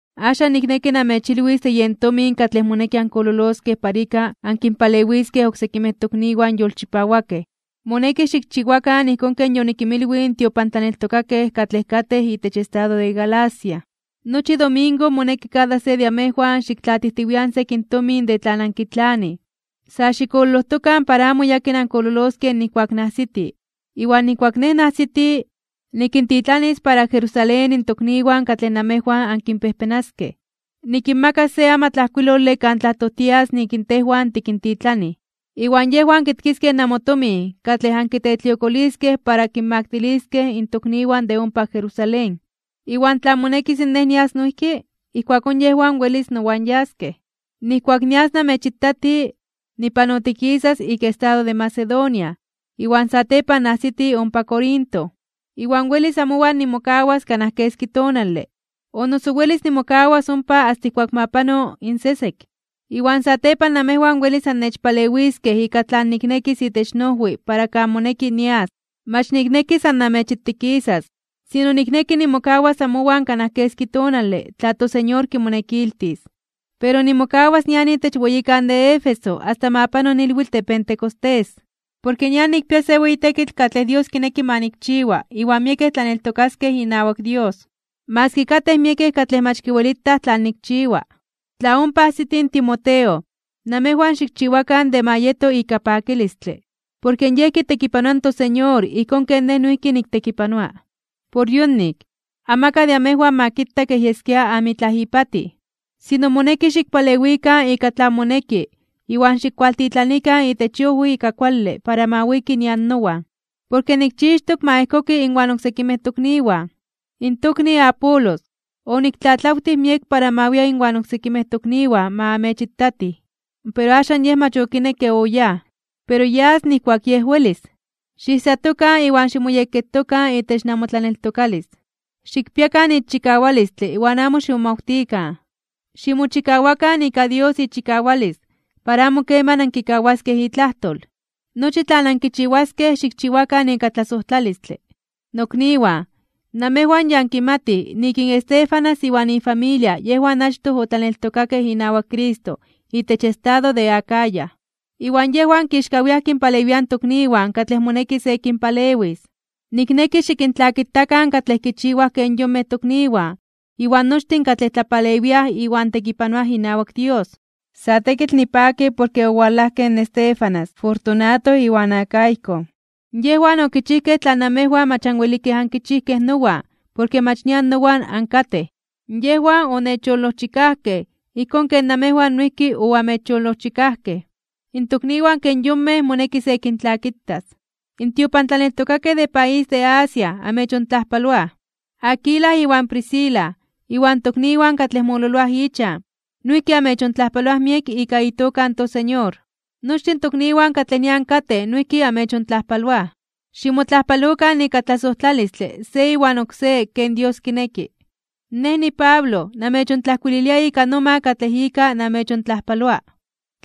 Axan nikneki namechilwis de yen tomin katlej moneki ankololoskej para ika ankinpalewiskej oksekimej tokniwan yolchipawakej. Moneki xikchiwakan ijkón ken yonikinmilwij in tiopantlaneltokakej katlej katej itech estado de Galacia. Nochi domingo moneki kada se de amejwan xiktlatijtiwian sekin tomin de tlan ankitlanij. Sa xikololojtokan para amo yakin ankololoskej nijkuak niajsiti. Iwan nijkuak nej niajsiti, nikintitlanis para Jerusalén in tokniwan katlej namejwan ankinpejpenaskej. Nikinmakas se amatlajkuilole kan tlajtojtias nik tejwan tikintitlanij, iwan yejwan kitkiskej namotomin katlej ankitetliokoliskej para kinmaktiliskej in tokniwan de ompa Jerusalén. Iwan tla monekis nej nias noijki, ijkuakón yejwan welis nowan yaskej. Nijkuak nias namechitati, nipanotikisas ik estado de Macedonia, iwan satepan niajsiti ompa Corinto. Iwan welis amowan nimokawas kanaj keski tonale. O noso welis nimokawas ompa asta ijkuak ma pano in sesek, iwan satepan namejwan welis annechpalewiskej ika tlan niknekis itech noojwi para kan moneki nias. Mach nikneki san namechitikisas, sino nikneki nimokawas amowan kanaj keski tonale, tla toSeñor kimonekiltis. Pero nimokawas nian itech weyikan de Éfeso asta ma pano ilwitl de Pentecostés. Porke nian nikpia se weyi tekitl katlej Dios kineki ma nikchiwa iwan miekej tlaneltokaskej inawak Dios, maski katej miekej katlej mach kiwelitaj tlan nikchiwa. Tla ompa ajsiti in Timoteo, namejwan xikchiwakan de ma yeto ika pakilistle, porke yej kitekipanoa in toSeñor ijkón ken nej noijki niktekipanoa. Por yonik, amakaj de amejwan ma kita kej yeskia amitlaj ipatij. Sino moneki xikpalewikan ika tlan moneki iwan xikwaltitlanikan itech iojwi ika kuale para ma wiki nian nowan, porke nikchixtok ma ejkoki inwan oksekimej tokniwan. In tokni Apolos, oniktlatlawtij miek ma wia inwan oksekimej tokniwan ma amechitatij, pero axan yej mach okinekke oyáj. Pero yas nijkuak yej welis. Xiijsatokan iwan ximoyekketokan itech namotlaneltokalis. Xikpiakan ixchikawalistle iwan amo ximomawtikan. Ximochikawakan ika Dios ichikawalis para amo keman ankikawaskej itlajtol. Nochi tlan ankichiwaskej, xikchiwakan ika tlasojtlalistle. Nokniwan, namejwan ya ankimatij nik in Estéfanas iwan ifamilia yejwan achtoj otlaneltokakej inawak Cristo itech estado de Acaya. Iwan yejwan kixkawiaj (momeliaj) kinpalewiaj in tokniwan katlej moneki se kinpalewis. Nikneki xikintlakitakan katlej kichiwaj ken yonmej tokniwan iwan nochtin katlej tlapalewiaj iwan tekipanoaj inawak Dios. Sa tekitl nipaki porke owalajkej in Estéfanas, Fortunato, iwan Acaico. Yejwan okichijkej tlan namejwan mach anwelikej ankichijkej nowan porke mach nian nowan ankatej. Yejwan onechyolojchikajkej ijkón ken namejwan noijki oamechyolojchikajkej. In tokniwan ken yonmej moneki se kintlakitas. In tiopantlaneltokakej de país de Asia amechontlajpaloaj. Aquila iwan Priscila, iwan tokniwan katlej mololoaj ichan, noijki amechontlajpaloaj miek ika itoka in toSeñor. Nochtin tokniwan katlej nian katej noijki amechontlajpaloaj. Ximotlajpalokan ika tlasojtlalistle se iwan oksé ken Dios kineki. Nej niPablo namechontlajkuililia ika noma katlej ika namechontlajpaloa.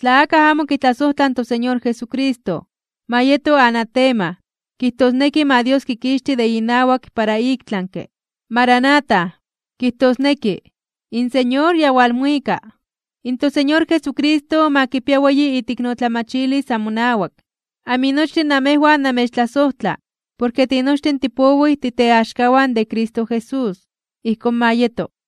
Tla akaj amo kitlasojtla in toSeñor Jesucristo, ma yeto anatema, kijtosneki ma Dios kikixti de inawak para iktlanke (ik tlami). ¡Maranata! Kijtosneki ¡In Señor ya walmuika! In toSeñor Jesucristo ma kipia weyi iteiknotlamachilis amonawak. Aminochtin namejwan namechtlasojtla porke tinochtin tipowij titeaxkawan de Cristo Jesús. Ijkón ma yeto.